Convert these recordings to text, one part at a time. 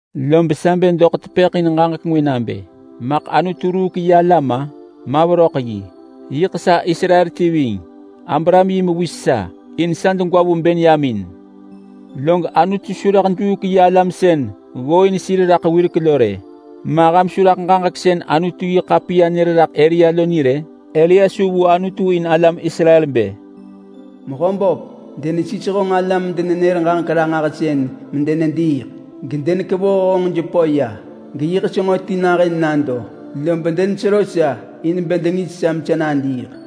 Lob sa bë doḳ tepëḳ in ġaġek ngwë nabë maḳ Anutu ruuk yi alam-a? Ma veröḳ yi! Yiḳ sa Israel ti ving. Abraham yi mewis sa, in sa degwa vu Benyamin. Log Anutu su rëḳ juuk yi alam sën ggooin sir raḳ wirek lo rë. Ma ham su raḳ ġaġek sën Anutu-yi-ḳapiya nër raḳ Elia lo ni rë? Elia su vu Anutu in alam Israel bë, “Mehöböp! Denesis honġ alam-denenër-ġaġek-ranġahsën medenediiḳ. Gedenekevoh honġ jepö ya. Geyiḳ senġo ti nahën nado, lob denesero sa in bë dengis sa mesa nadiiḳ.”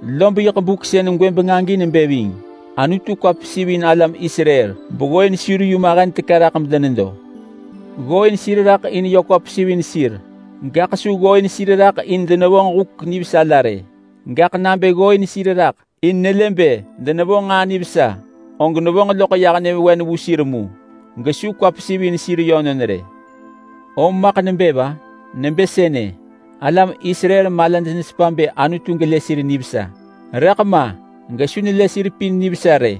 Lob yiḳ buk sën gwëbeng agi nebë ving. Anutu kwa pesivin alam Israel beggooin sir yu mahen teka raḳ medenedo. Ggooin sir raḳ in yö kwa pesiv in sir, gaḳ su ggooin sir raḳ in denevonġ huk nivesa la rë. Gaḳ nabë ggooin sir raḳ in nelë bë denevonġ nġaa nivesa, og nevonġ loḳ yah nyëvewen vu sir mu gesu kwa pesiv in sir yönon rë. Om maḳ nebë va? Nebë sënë: Alam Israel malaj nesepa bë Anutu gelë sir nivesa, rëḳ ma gesu nelë sir pin nivesa rë.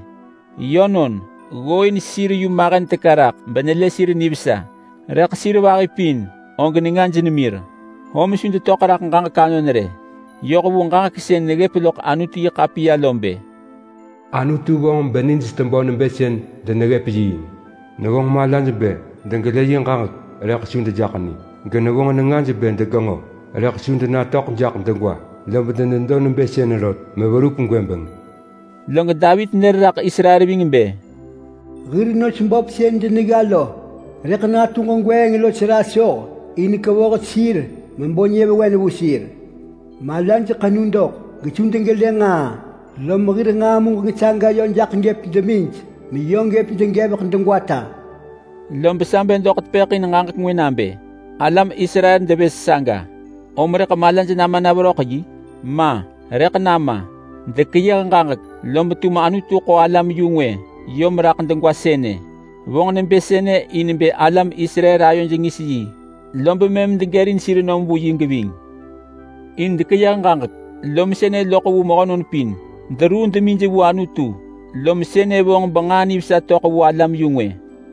Yönon, ggooin sir yu mahen teka raḳ benelë sir nivesa, rëḳ sir vahi pin og nengaj nemir, om su detöḳ raḳ ġaġek anon rë. Yoh vu ġaġek sën neggëp loḳ Anutu-yi-ḳapiya lo bë: “Anutu vonġ benij tebö nebë sën deneggëp yiing. Nevonġ malaj bë degelë yi ġaġek rëḳ su dejaḳ ni, genevonġ nengaj bë degenġo rëḳ su denatöḳ jaḳ degwa. Lob denedo nebë sënë rot meverup gwëbeng.” Log Davit nër raḳ Israel ving bë: “Hir nos böp sën denegga lo rëḳ natu ġegweeng los rasoh in kevoh sir mebo nyëvewen vu sir. Malaj ḳenu doḳ gesu degelë nġaa, lom hir nġaa muġeng saga yö jaḳ gëp demij meyö gëp degevek degwata.” Lob sa bë doḳ tepëḳ in ġaġek ngwë nabë: Alam Israel devës saga, om rëḳ malaj nama na veröḳ yi? Ma! Rëḳ nama! Dekeyëh ġaġek lob tum Anutu ḳo alam-yu-ngwë yom raḳ sënë. Vonġ nebë sënë in bë alam Israel ayoj ngis yi, lob mëm degërin sir nom vu yi geving. In dekeyëh ġaġek lom sënë loḳ vu mehönon pin. Deruu demij vu Anutu, lob sënë vonġ benġaa nivesa töḳ vu alam-yu-ngwë.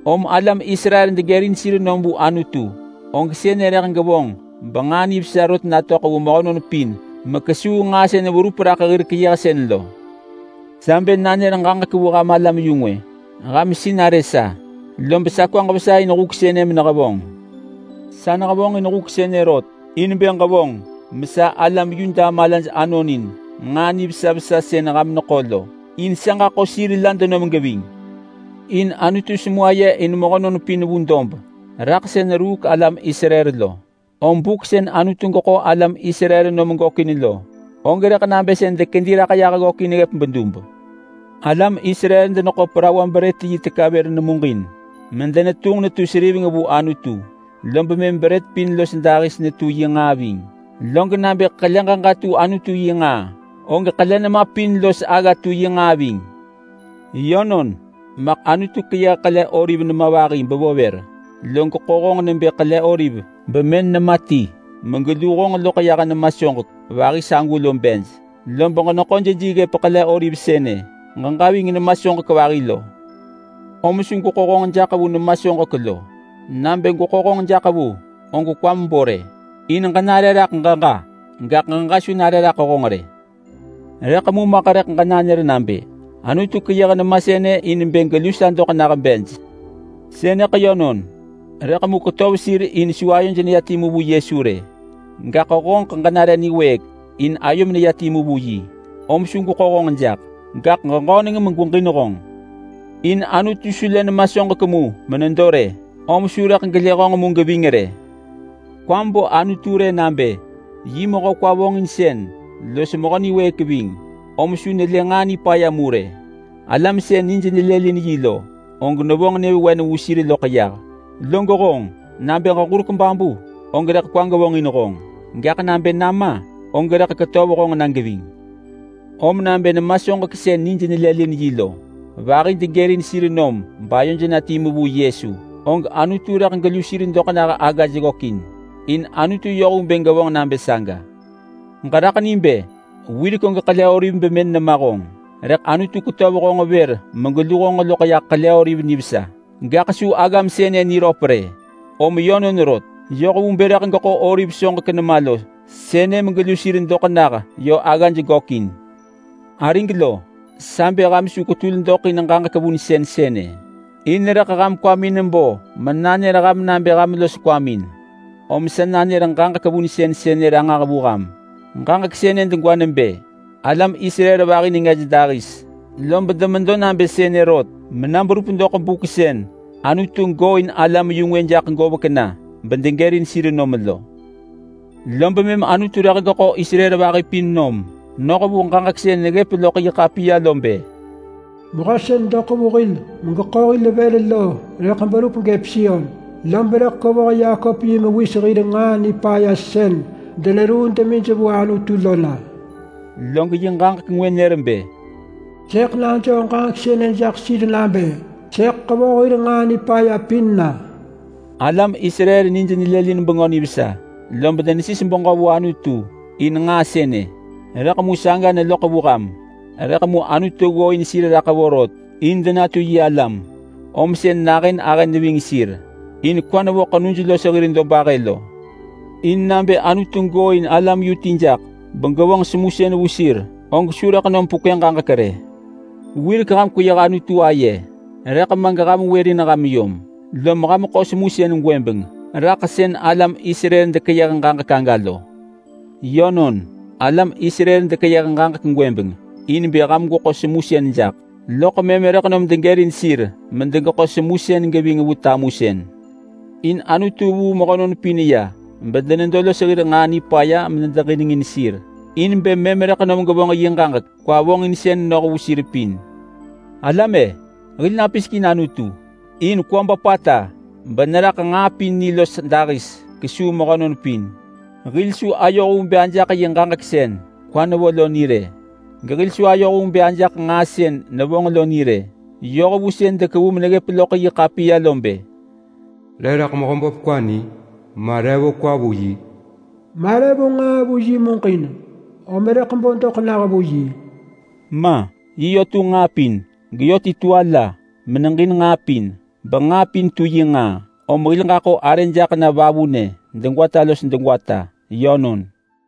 Om alam Israel degërin sir nom vu Anutu, og sënë rëḳ gevonġ benġaa nivesa rot natöḳ vu mehönon pin mekesuu nġaa sën verup raḳ hir keyëhsën lo. Sa bë nanër ġaġek vu ham alam-yu-ngwë: Ham sinarë sa, lob sa kwaġ vesa in huk sënë menehevonġ. Sa nehevonġin huk sënë rot in bë gevonġ mesa alam Yuda malaj anonin nġaa nivesa vesa sën ham neḳo lo, in sa ġaḳo sir la denom geving. In Anutu semu aye in mehönon raḳ sën ruuk alam Israel lo. Om buk sën Anutu geḳo alam Israel nom gökin lo, og rëḳ nabë sën dekedi raḳ yah ggökin ggëp bedub. Alam Israel deneḳo parawa-brët-yi nemaj beron ti vër nemuġin medenetunġ netu seriveng vu Anutu lob mëm brët pin los dahis netu yi nġaa ving. Log nabë ḳele ġeġa tu Anutu yi nġaa, og ḳele nema pin los agga tu yi nġaa ving. Yönon, maḳ Anutu keyëh ḳele oliv nema vahi bevo vër, log ḳo honġ nebë ḳele oliv bemën nema ti megelu honġ loḳ yah nema vahi sagu lo bej. Lob ġeneḳo jeji ggëp ḳele oliv sënë ġeġa ving nema soġek vahi lo. Om su gweḳo honġ jaḳ vu nema soġek lo. Nabë gweḳo honġ jaḳ vu, og kwam bo rë. In ġenare raḳ ġeġa, gaḳ ġeġa su nare raḳ honġ rë. Rëḳ mu maḳ rëḳ ġenanër nabë, “Anutu keyëh nema pin sënë in bë gelu sa doḳ nah bej.” Sënëḳ yönon, rëḳ mu ketöv sir in su ayoj neya timu vu Yesu rë. Gaḳ honġeḳ ġenare niwëëk in ayom neya timu vu yi, om su gweḳo honġ jaḳ. Gaḳ ġeġöneng megweġin honġ. In Anutu su lë nema soġek mu menedo rë, om su rëḳ gelë honġ mu geving rë. Kwam bo Anutu rë, nabë yi mehö kwa vonġinsën los mehö niwëëk ving, om su nelë nġaa nipaya mu rë. Alam sën nij nelëlin yi lo, og nevonġ nyëvewen vu sir loḳ yah. Log honġ, nabë ġeġurek babu, og rëḳ kwa gevonġin honġ, gaḳ nabë nama, og rëḳ ketöv honġ na geving. Om nabë nema soġek sën nij nelëlin yi lo vahi degërin sir nom bayoj na timu vu Yesu, og Anutu rëḳ gelu sir doḳ nah aggaj gökin. In Anutu yoh vu bë gevonġ nabë saga. Ġeraḳ ni bë wirek og ḳele oliv bemën nema honġ, rëḳ Anutu ketöv honġ vër megelu honġ loḳ yah oliv nivesa, gaḳ su aggam sënë niröp rë. Om yönon rot, yoh vu bë rëḳ geḳo oliv soġek nema lo sënë megelu sir doḳ nah yö aggaj gökin. Arig lo, sa bë ham su kwetul doḳ in ġaġek vunsën sënë. In rëḳ ham kwamin bo menanër ham nabë ham los kwamin. Om sa nanër ġaġek vunsën sënë ranġah vu ham. Ġaġek sënë degwa nebë: Alam Israel vahi nengaj dahis, lob demedo nabë sënë rot mena berup doḳ buk sën Anutu gooin alam-yu-ngwë jaḳ govek na bedegërin sir nom lo. Lob mëm Anutu rëḳ geḳo Israel vahi pin nom noh vu ġaġek sën neggëp loḳ yi ḳapiya lo bë: “Mehö sën doḳ vu hil megeḳo hil vër lo rëḳ berup gëp Sion. Lob rëḳ kevoh Yakop yi mewis hir nġaa nipaya sën deneruu demij vu Anutu lo na.” Log yi ġaġek ngwë nër bë: “Sëḳ najoo ġaġek sënë jaḳ sir nabë sëḳ ḳevoh hir nġaa nipaya pin na.” Alam Israel nij nelëlin Bengö Nivesa, lob denesis beġö vu Anutu in nġaa sënë, rëḳ mu saga neloḳ vu ham. Rëḳ mu Anutu ggooin sir raḳ vorot in denatu yi alam, om sën nahën ahë neving sir. In kwa nevo ḳenuj los hir dobahë lo. In nabë Anutu gooin alam yu ti jaḳ begevonġ semusën vu sir, og su rëḳ nom pekwë ġaġek rë. Wirek ham kweyëh Anutu aye, rëḳ ma geham wërin ham yom, lom ham ḳo semusën gwëbeng raḳ sën alam Israel dekeyëh aga lo. Yönon, alam Israel dekeyëh ġaġek gwëbeng in bë ham gweḳo semusën jaḳ, loḳ mëm rëḳ nom degërin sir medegeḳo semusën geving vu tamusën. In Anutu vuu mehönon pin ya bedenedo los hir nġaa nipaya medeġinengin sir in bë mëm rëḳ gevonġ yi ġaġek kwa vonġinsën noh vu sir pin. Alam-e! Hil napisek in Anutu in kwa böpata beneraḳ nġaa pin ni los dahis kesuu mehönon pin. Hil su ayoh vu bë ajaḳ yi ġaġek sën kwa nevo lo ni rë, gehil su ayoh vu bë ajaḳ nġaa sën nevonġ lo ni rë. Yoh vu sën dekevu meneggëp loḳ yi ḳapiya lo bë: “Re raḳ Mehöböp kwa ni? Ma re vo kwa vu yi?” “Ma re vo nġaa vu yi muġin om rëḳ bo doḳ nah vu yi?” Ma! Yi yö tunġ nġaa pin. Geyö ti tu ala beneġin nġaa pin. Benġaa pin tu yi nġaa. Om hil ġaḳo arë jaḳ na vavunë degwata los degwata. Yönon.